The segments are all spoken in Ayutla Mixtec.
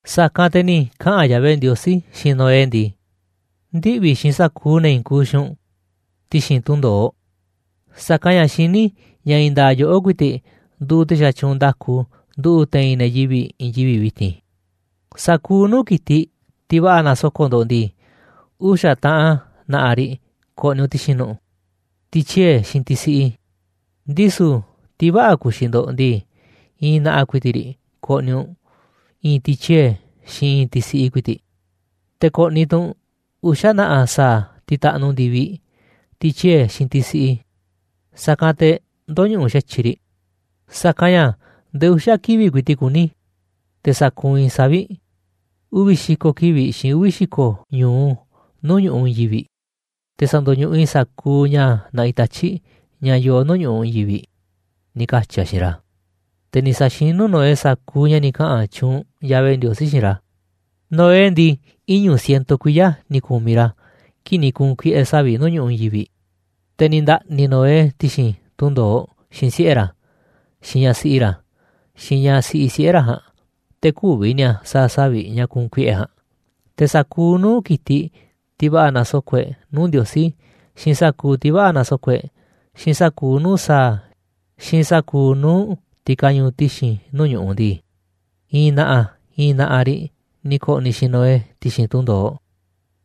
Sa̱kanꞌ te̱ ni̱ kaꞌa̱n Yahvé Ndiosí xiinꞌ Noé ndii: ―Ndiꞌvi̱ xiinꞌ sa̱kuuꞌ ne̱ i̱i̱n kuuꞌ xiinꞌ u̱nꞌ ti̱xi̱n tunꞌ ndo̱oꞌ, sa̱kanꞌ ña̱ xiní i̱ ña̱ i̱i̱n nda̱a̱ꞌ yoꞌó ku̱i̱ti̱ꞌ nduuꞌ te̱ xatyuunꞌ nda̱ku nduꞌu̱ꞌ te̱i̱n ne̱ yivi̱ꞌ i̱i̱n yivi̱ꞌ vi̱ti̱n. Sa̱kuuꞌ nuu̱ꞌ ki̱tiꞌ, tiꞌ va̱ꞌa̱ na̱soko̱ꞌ ndo̱ꞌ ndii, uxa̱ taꞌan na̱ꞌa̱ riꞌ ko̱ꞌni̱ u̱nꞌ ti̱xi̱n nu̱ꞌ, tiꞌ tyie̱ xiinꞌ tiꞌ siꞌi, ndisu̱ tiꞌ vä̱ꞌa̱ ka̱xi̱ꞌ ndo̱ꞌ ndii, i̱i̱n na̱ꞌa̱ ku̱i̱ti̱ꞌ riꞌ ko̱ꞌni̱ u̱nꞌ, i̱i̱n tiꞌ tyie̱ xiinꞌ i̱i̱n tiꞌ siꞌi ku̱i̱ti̱ꞌ. Te̱ ko̱ꞌni̱ tu̱ u̱nꞌ uxa̱ na̱ꞌa̱ sa̱a̱ tiꞌ taꞌnuꞌ ndi̱viꞌ, tiꞌ tyie̱ xiinꞌ tiꞌ siꞌi, sa̱kanꞌ te̱ ndö̱ñuꞌuꞌ xa̱tyiꞌ riꞌ. Sa̱kanꞌ ña̱ ndee uxa̱ kivi̱ꞌ ku̱i̱ti̱ꞌ kuní, te̱ sa̱kuunꞌ i̱ savi̱ꞌ, uvi̱ xi̱ko̱ kivi̱ꞌ xiinꞌ uvi̱ xi̱ko̱ ñu̱u nuu̱ꞌ ñu̱ꞌuꞌ i̱i̱n yivi̱ꞌ, te̱ sa̱ndo̱ñuꞌuꞌ i̱ sa̱kuuꞌ ña̱ naꞌiꞌ tatyi̱ꞌ ña̱ yooꞌ nuu̱ꞌ ñu̱ꞌuꞌ i̱i̱n yivi̱ꞌ ―ni̱ katyi̱ a̱ xiinꞌ ra̱. Te̱ ni̱ sa̱xinú Noé sa̱kuuꞌ ña̱ ni̱ kaꞌa̱n tyuunꞌ Yahvé Ndiosí xiinꞌ ra̱. Noé ndii, iñu̱ ciento kuiya̱ ni̱ ku̱miꞌ ra̱ kii̱ꞌ ni̱ ku̱u̱n kuiꞌe̱ savi̱ꞌ nuu̱ꞌ ñu̱ꞌuꞌ i̱i̱n yivi̱ꞌ. Te̱ ni̱ nda̱ꞌni̱ Noé ti̱xi̱n tunꞌ ndo̱oꞌ xiinꞌ siꞌe̱ ra̱, xiinꞌ ñaꞌ siꞌi ra̱, xiinꞌ ñaꞌ siꞌi siꞌe̱ ra̱ ja̱a̱nꞌ, te̱ kü̱vi̱ ni̱a̱ sa̱a̱ savi̱ꞌ ña̱ ku̱u̱n kuiꞌe̱ ja̱a̱nꞌ. Te̱ sa̱kuuꞌ nuu̱ꞌ ki̱tiꞌ, tiꞌ va̱ꞌa̱ na̱soko̱ꞌ e̱ꞌ nuu̱ꞌ Ndiosí, xiinꞌ sa̱kuuꞌ tiꞌ vä̱ꞌa̱ na̱soko̱ꞌ e̱ꞌ, xiinꞌ sa̱kuuꞌ nuu̱ꞌ sa̱a̱, xiinꞌ sa̱kuuꞌ nuu̱ꞌ tiꞌ kañuuꞌ ti̱xi̱n nuu̱ꞌ ñu̱ꞌuꞌ ndii, i̱i̱n na̱ꞌa̱ i̱i̱n na̱ꞌa̱ riꞌ ni̱ ko̱ꞌni̱ xiinꞌ Noé ti̱xi̱n tunꞌ ndo̱oꞌ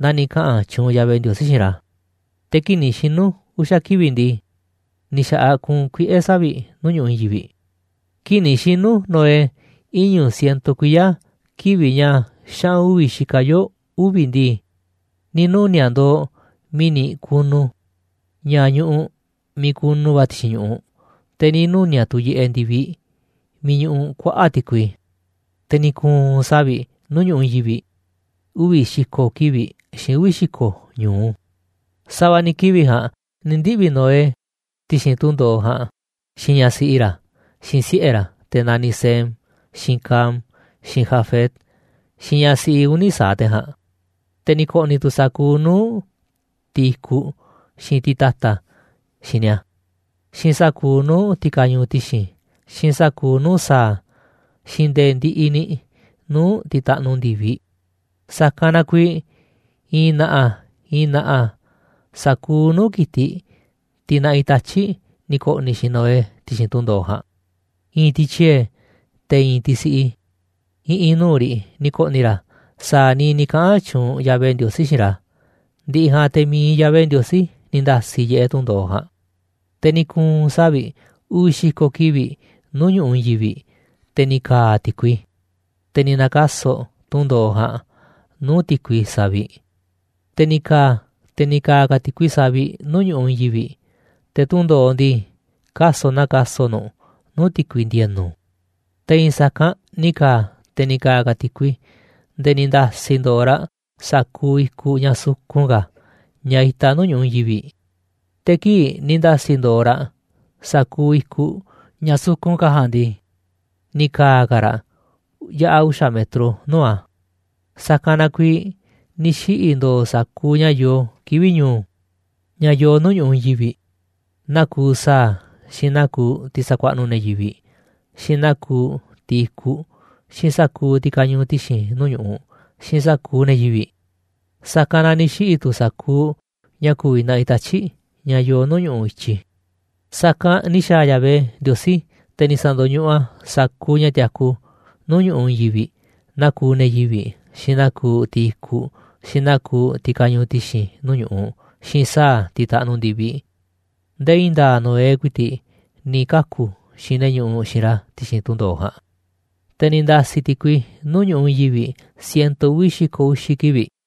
naa ni̱ kaꞌa̱n tyuunꞌ Yahvé Ndiosí xiinꞌ ra̱. Te̱ kii̱ꞌ ni̱ xinu̱ uxa̱ kivi̱ꞌ ndii, ni̱ xa̱ꞌaꞌ kuunꞌ kuiꞌe̱ savi̱ꞌ nuu̱ꞌ ñu̱ꞌuꞌ i̱i̱n yivi̱ꞌ. Kii̱ꞌ ni̱ xinu̱ Noé iñu̱ ciento kuiya̱, kivi̱ꞌ ña̱ xaꞌu̱n uvi̱ xikaꞌ yoo̱ uvi̱ ndii, ni̱ nuni̱a̱ꞌ ndo̱o̱ mi̱ni̱ kunu, ña̱ ñuꞌuꞌ miiꞌ kunu va̱ ti̱xi̱n ñu̱ꞌuꞌ, te̱ ni̱ nuni̱a̱ꞌ tu̱ yiꞌeꞌ ndi̱viꞌ miiꞌ ñuꞌuꞌ kuaꞌa̱ꞌ ti̱kui. Te̱ ni̱ ku̱u̱n savi̱ꞌ nuu̱ꞌ ñu̱ꞌuꞌ i̱i̱n yivi̱ꞌ uvi̱ xi̱ko̱ kivi̱ꞌ, xiinꞌ uvi̱ xi̱ko̱ ñu̱u. Sa̱va̱ ni̱ kivi̱ꞌ ja̱a̱nꞌ ni̱ ndiꞌvi̱ Noé ti̱xi̱n tunꞌ ndo̱oꞌ ja̱a̱nꞌ xiinꞌ ñaꞌ siꞌi ra̱, xiinꞌ siꞌe̱ ra̱, te̱ na̱niꞌ Sem, xiinꞌ Cam, xiinꞌ Jafet, xiinꞌ ñaꞌ siꞌi uni̱ sa̱aꞌ te̱ ja̱a̱nꞌ. Te̱ ni̱ ko̱ꞌni̱ tu̱ sa̱kuuꞌ nuu̱ꞌ tiꞌ i̱kuꞌ, xiinꞌ tiꞌ ta̱ta̱ xiinꞌ ni̱a̱, xiinꞌ sa̱kuuꞌ nuu̱ꞌ tiꞌ kañuuꞌ ti̱xi̱n, xiinꞌ sa̱kuuꞌ nuu̱ꞌ sa̱a̱, xiinꞌ nde̱e̱ ndiꞌiꞌ ni̱ nuu̱ꞌ tiꞌ taꞌnuꞌ ndi̱viꞌ. Sa̱kanꞌ na kuiiꞌ i̱i̱n na̱ꞌa̱ i̱i̱n na̱ꞌa̱ sa̱kuuꞌ nuu̱ꞌ ki̱tiꞌ, tiꞌ naꞌiꞌ tatyi̱ꞌ ni̱ ko̱ꞌni̱ xiinꞌ Noé ti̱xi̱n tunꞌ ndo̱oꞌ ja̱a̱nꞌ. I̱i̱n tiꞌ tyie̱, te̱ i̱i̱n tiꞌ siꞌi, i̱ꞌi̱n nuu̱ꞌ riꞌ ni̱ ko̱ꞌni̱ ra̱ sa̱a̱ niiꞌ ni̱ kaꞌa̱n tyuunꞌ Yahvé Ndiosí xiinꞌ ra̱, ndi̱ꞌi̱ ja̱a̱nꞌ te̱ mi̱iꞌ Yahvé Ndiosí ni̱ nda̱si̱ yiꞌeꞌ tunꞌ ndo̱oꞌ ja̱a̱nꞌ. Te̱ ni̱ ku̱u̱n savi̱ꞌ uvi̱ xi̱ko̱ kivi̱ꞌ nuu̱ꞌ ñu̱ꞌuꞌ i̱i̱n yivi̱ꞌ, te̱ ni̱ ka̱a̱ ti̱kui, te̱ ni̱ na̱ka̱so̱ꞌ tunꞌ ndo̱oꞌ ja̱a̱nꞌ nuu̱ꞌ ti̱kui saviꞌ. Te̱ ni̱ ka̱a̱, te̱ ni̱ ka̱a̱ ka̱ ti̱kui saviꞌ nuu̱ꞌ ñu̱ꞌuꞌ i̱i̱n yivi̱ꞌ, te̱ tunꞌ ndo̱oꞌ ndii, kaso̱ꞌ naa kaso̱ꞌ nu̱ꞌ nuu̱ꞌ ti̱kui ndi̱e̱nu̱. Te̱ i̱i̱n sa̱kanꞌ ni̱ ka̱a̱, te̱ ni̱ ka̱a̱ ka̱ ti̱kui nde̱e̱ ni̱ nda̱si̱ ndo̱o̱ raꞌ sa̱kuuꞌ i̱kuꞌ ña̱ sukun ka̱, ña̱ itaꞌ nuu̱ꞌ ñu̱ꞌuꞌ i̱i̱n yivi̱ꞌ. Te̱ kii̱ꞌ ni̱ nda̱si̱ ndo̱o̱ raꞌ sa̱kuuꞌ i̱kuꞌ ña̱ sukun ka̱ ja̱a̱nꞌ ndii, ni̱ ka̱a̱ ka̱ raꞌ yaꞌa̱ uxa̱ metro nuu̱ꞌ a̱. Sa̱kanꞌ na kuiiꞌ ni̱ xiꞌi̱ ndo̱o̱ sa̱kuuꞌ ña̱ yoo kivi̱ꞌ ñu̱u̱, ña̱ yoo nuu̱ꞌ ñu̱ꞌuꞌ i̱i̱n yivi̱ꞌ: Naa kuuꞌ sa̱a̱, xiinꞌ naa kuuꞌ tiꞌ sakuaꞌnuꞌ ne̱ yivi̱ꞌ, xiinꞌ naa kuuꞌ tiꞌ i̱kuꞌ, xiinꞌ sa̱kuuꞌ tiꞌ kañuuꞌ ti̱xi̱n nuu̱ꞌ ñu̱ꞌuꞌ, xiinꞌ sa̱kuuꞌ ne̱ yivi̱ꞌ. Sa̱kanꞌ na ni̱ xiꞌi̱ tu̱ sa̱kuuꞌ ña̱ ku̱vi̱ naꞌiꞌ tatyi̱ꞌ, ña̱ yoo nuu̱ꞌ ñu̱ꞌuꞌ i̱tyi. Sa̱kanꞌ ni̱ xa̱a̱ Yahvé Ndiosí, te̱ ni̱ sa̱ndo̱ñuꞌuꞌ a̱ sa̱kuuꞌ ña̱ tiaku nuu̱ꞌ ñu̱ꞌuꞌ i̱i̱n yivi̱ꞌ: Naa kuuꞌ ne̱ yivi̱ꞌ, xiinꞌ naa kuuꞌ tiꞌ i̱kuꞌ, xiinꞌ naa kuuꞌ tiꞌ kañuuꞌ ti̱xi̱n nuu̱ꞌ ñu̱ꞌuꞌ, xiinꞌ sa̱a̱ tiꞌ taꞌnuꞌ ndi̱viꞌ, nde̱e̱ i̱i̱n nda̱a̱ꞌ Noé ku̱i̱ti̱ꞌ ni̱ kaku̱ xiinꞌ ne̱ ñuꞌuꞌ xiinꞌ ra̱ ti̱xi̱n tunꞌ ndo̱oꞌ ja̱a̱nꞌ. Te̱ ni̱ nda̱si̱ ti̱kui nuu̱ꞌ ñu̱ꞌuꞌ i̱i̱n yivi̱ꞌ ciento uvi̱ xi̱ko̱ uxi̱ kivi̱ꞌ.